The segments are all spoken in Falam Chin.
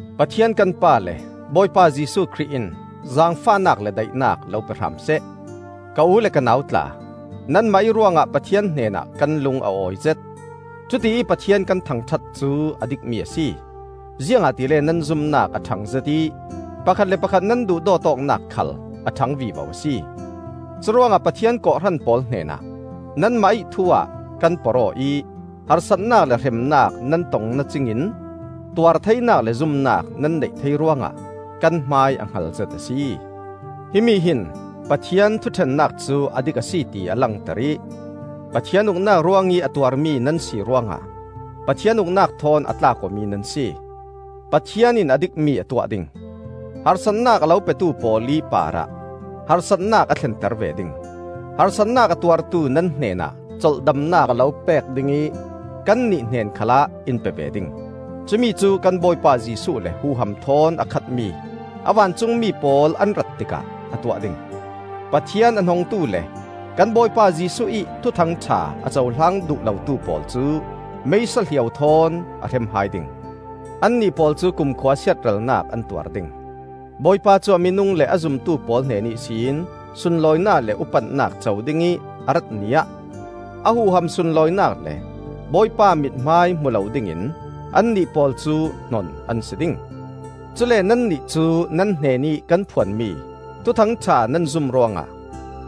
Pathian kan Pa le Bawipa Jesuh Khrih in zaangfahnak le daihnak lo pe hram seh. Ka u le ka nau tla, nanmah ih ruangah Pathian hnenah kan lung a awizet. Cutiih Pathian kan thangṭhat cu a dikmi a si, ziangahtile nan zumnak a ṭhangzet ih pakhat le pakhat nan duhdawt awknak khal a ṭhang vivo a si. Curuangah Pathian kawhhran pawl hnenah nanmah ih thu-ah kan porh-aw ih harsatnak le hremnak nan tong nacingin tuartheinak le zumnak nan neih thei ruangah kan hmai a hngalzet a si. Himi hin Pathian thuṭhennak cu a dik a si ti a langter ih Pathian uknak ruangih a tuarmi nan si ruangah Pathian uknak thawn a tlak awmi nan si. Pathian in a dikmi a tuah ding. Harsatnak a lo petu pawl ih parah harsatnak a thlenter ve ding; harsatnak a tuartu nan hnenah colhdamnak a lo pek ding ih kannih hnen khalah in pe ve ding. Cumi cu kan Bawipa Jesuh le huham thawn a khatmi a vancungmi pawl an rat tikah a tuah ding; Pathian a hnongtu le kan Bawipa Jesuh ih Thuthang ṭha a cohlang duh lotu pawl cu meisa hliau thawn a hrem hai ding. Annih pawl cu kumkhua siatralnak an tuar ding. Bawipa cu a minung le a zumtu pawl hnen ihsin sunlawinak le upatnak co dingih a rat Ni ah, a huham sunlawinak le Bawipa mithmai hmu lo dingin annih pawl cu hnon an si ding. Cule nannih cu nan hnenih kan phuan mi Thuthang ṭha nan zum ruangah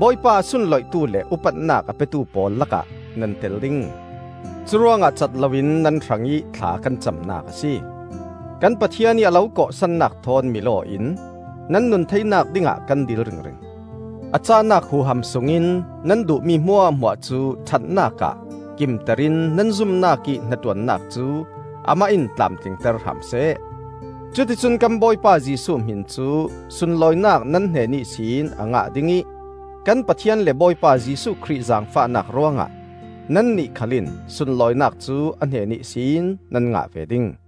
Bawipa a sunloihtu le upatnak a petu pawl lakah nan tel ding. Curuangah cat loin nan hrangih thla kan camnak a si. Kan Pathian ih a lo kawhsannak thawn mil-aw in nan nun theinak dingah kan dil ringring. A cahnak huham sungin nan duhmi hmuahhmuah cu ṭhatnak ah kimter in nan zumnak ih hnaṭuannak cu amah in tlamtlingter hram seh. Cuticun kan Bawipa Jesuh hmin cu sunlawinak nan hnen ihsin a ngah dingih kan Pathian le Bawipa Jesuh Khrih zaangfahnak ruangah nannih khal in sunlawinak cu a hnen ihsin nan ngah ve ding.